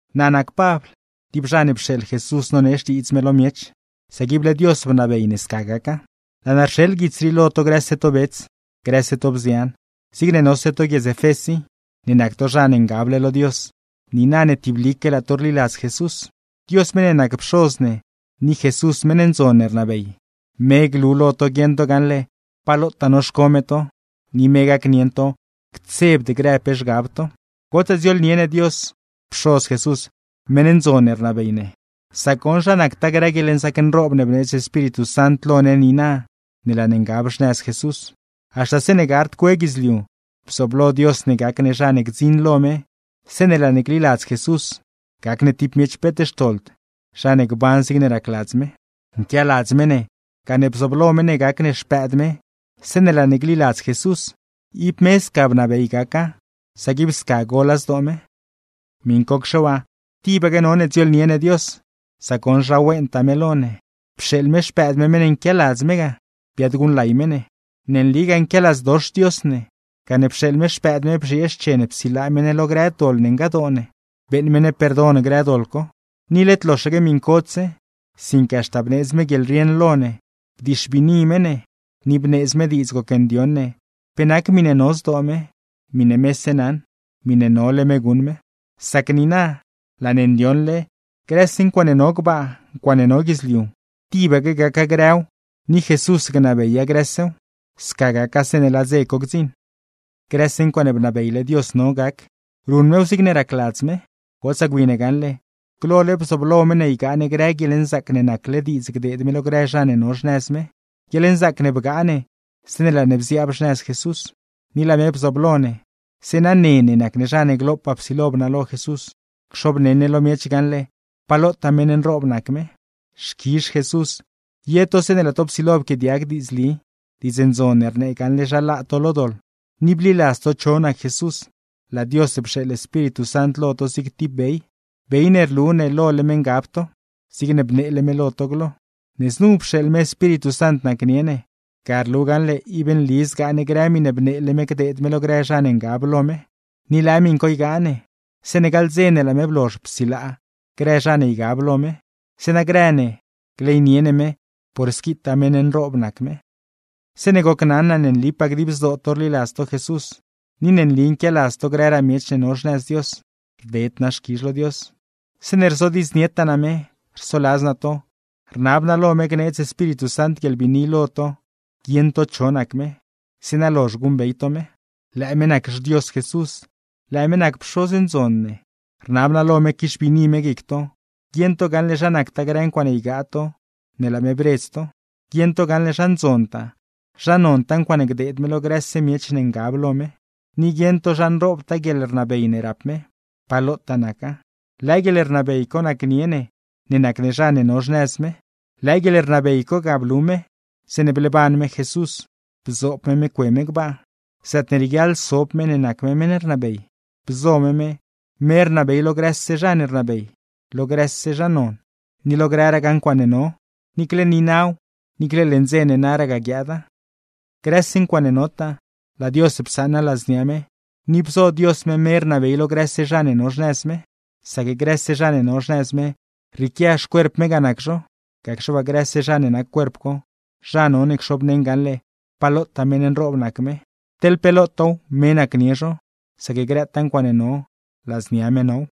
Naa nac Pabl, tib zha ne pxeeḻ Jesús nonee Xtiidz me lo miech, sac ible Dios bnabey ne sca gaca. Laa naa rxeḻ guits rii lo to grëse to bets, grëse to bzian, zigne nose to guiedz Efés i, ne nac to zha ne ngable lo Dios niina ne tiblique laa to rliladz Jesús. Dios meṉ ne nac Pxoz ne, ni Jesús meṉ ndzon ne rnabey, me glu lo to guieṉ to gaṉle pa lotaa noxco me to, ni me gacnieṉ to ctsebd grë pe zhgab to. ¡Gotsaa dziooḻnie ne Dios, Pxoz Jesús, meṉ ndzon ne rnabey ne! Sac goṉ, zha nactaa grë guieḻnzaac nroob ne bneedz Espíritu Sant lo ne niina ne laa ne ngab xnëz Jesús. Haxta zeeṉe gard cue guidzliu, bzooblo Dios ne gac ne zha ne gdziṉ lo me zeeṉe laa ne gliladz Jesús, gac ne tib miech peet xtoḻd, zha ne gban zigne racladz me. Nquialadz me ne, gane bzooblo me ne gac ne xpëëd me zeeṉe laa ne gliladz Jesús, ib me sca bnabey gaca sac ib sca gola zdoo me. Miṉcocxe waa tibaque none dziooḻnie ne Dios, sac goṉ zha wentaa me lo ne, pxeeḻ me Xpëëd me meṉ ne nquialadz me ga, biaadguṉlay me ne. Ne nligaa nquialadzdox Dios ne, gane pxeeḻ me Xpëëd me bzhiee xchen psilaa me ne lo grë doḻ ne ngadoo ne, beeṉ me ne perdon grë doḻ co. Ni led loxaque miṉcodse, sinque haxta bneedz me guieḻrieṉ lo ne, bdixbiini me ne, ni bneedz me diidz gocndioṉ ne pe nac miṉe no zdoo me, miṉe mese naṉ, miṉe nole me guṉ me. Sac niina laa ne ndioṉle: Grëse ncuaaṉe no gbaa, ncuaaṉe no guidzliu, tibaque gaca grëw ni Jesús gnabeya grësew; sca gaca zeeṉe laa dze co gdziṉ. Grëse ncuaaṉe bnabeyle Dios no gac, ruṉ mew zigne racladz me. Gotsaa gwi ne gaṉle, glole bzooblo me ne ygaa ne grë guieḻnzaac ne nacle diidz gdeed me lo grë zha ne no xnëz me, guieḻnzaac ne bgaa ne zeeṉe laa ne bziaab xnëz Jesús. Ni laa me bzooblo ne, zeeṉa ne ne nac ne zha ne glopaa psilo bnalo Jesús, cxobneṉ ne lo miech gaṉle pa lotaa meṉ nroob nac me. Xquizh Jesús, ye to zeeṉe laa to psilo pquiaadiag diidzli, Diidz Ndzon ne rnee gaṉle zha laa to lo doḻ, ni bliladz to cho nac Jesús, laa Dios pxeeḻ Espíritu Sant lo to zig tib bey, bey ne rlu lole me ngab to; zigne bneele me glo. Ne znu pxeeḻ me Espíritu Sant nacnie ne, ga rlu gaṉle ib nli zgaa ne grë miṉe bneele me gdeed me lo grë zha ne ngab lo me, ni lëë miṉ co ygaa ne zeeṉe gaḻ dze ne laa me blozh psilaa grë zha ne ygab lo me; zeeṉa grë ne gleynie ne me por squitaa meṉ nroob nac me. Zeeṉe gocnaṉ naa ne nlipaa dib zdoo to rliladz to Jesús, ni ne nli nquialadz to grëraa miech ne no xnëz Dios, rded naa xquizh lo me. Zeeṉe rzodiidznietaa naa me, rsoladz naa to, rnab naa lo me gneedz Espíritu Sant guieḻbiini lo to guieṉ to cho nac me, zeeṉa lozh guṉbey to me. Lëë me nac xDios Jesús, lëë me nac Pxoz ndzon ne. Rnab naa lo me quixbiini me guic to, guieṉ to gaṉle zha nactaa grë ncuaaṉe ygaa to ne laa me bredz to, guieṉ to gaṉle zha ndzontaa, zha nontaa ncuaaṉe gdeed me lo grëse miech ne ngab lo me, ni guieṉ to zha nroobtaa guieḻrnabey ne rap Dios, pa lotaa naca; lëë guieḻrnabey co nacnie ne ne nac ne zha ne no xnëz me. Lëë guieḻrnabey co ga blu me zeeṉe bleeban me Jesús bzoob me me cue me gbaa, zaatne rieguiaḻ sob me ne nac me meṉ rnabey, bzo me me, me rnabey lo grëse zha ne rnabey, lo grëse zha ne non, ni lo grëragaa ncuaaṉe no; niicle niinaw, niicle leṉ dze ne naragaa guiaada. Grëse ncuaaṉe notaa, laa Dios psaṉa ladznia me, ni bzo Dios me me rnabey lo grëse zha ne no xnëz me. Sac grëse zha ne no xnëz me rrieequia xcuerp me ga nac zho, gacxe waa grëse zha ne nac cuerp co, zha none cxobneṉ gaṉle pa lotaa meṉ nroob nac me. Teḻ pe lotaaw me nacnie zho, sac grëtaa ncuaaṉe no ladznia me now.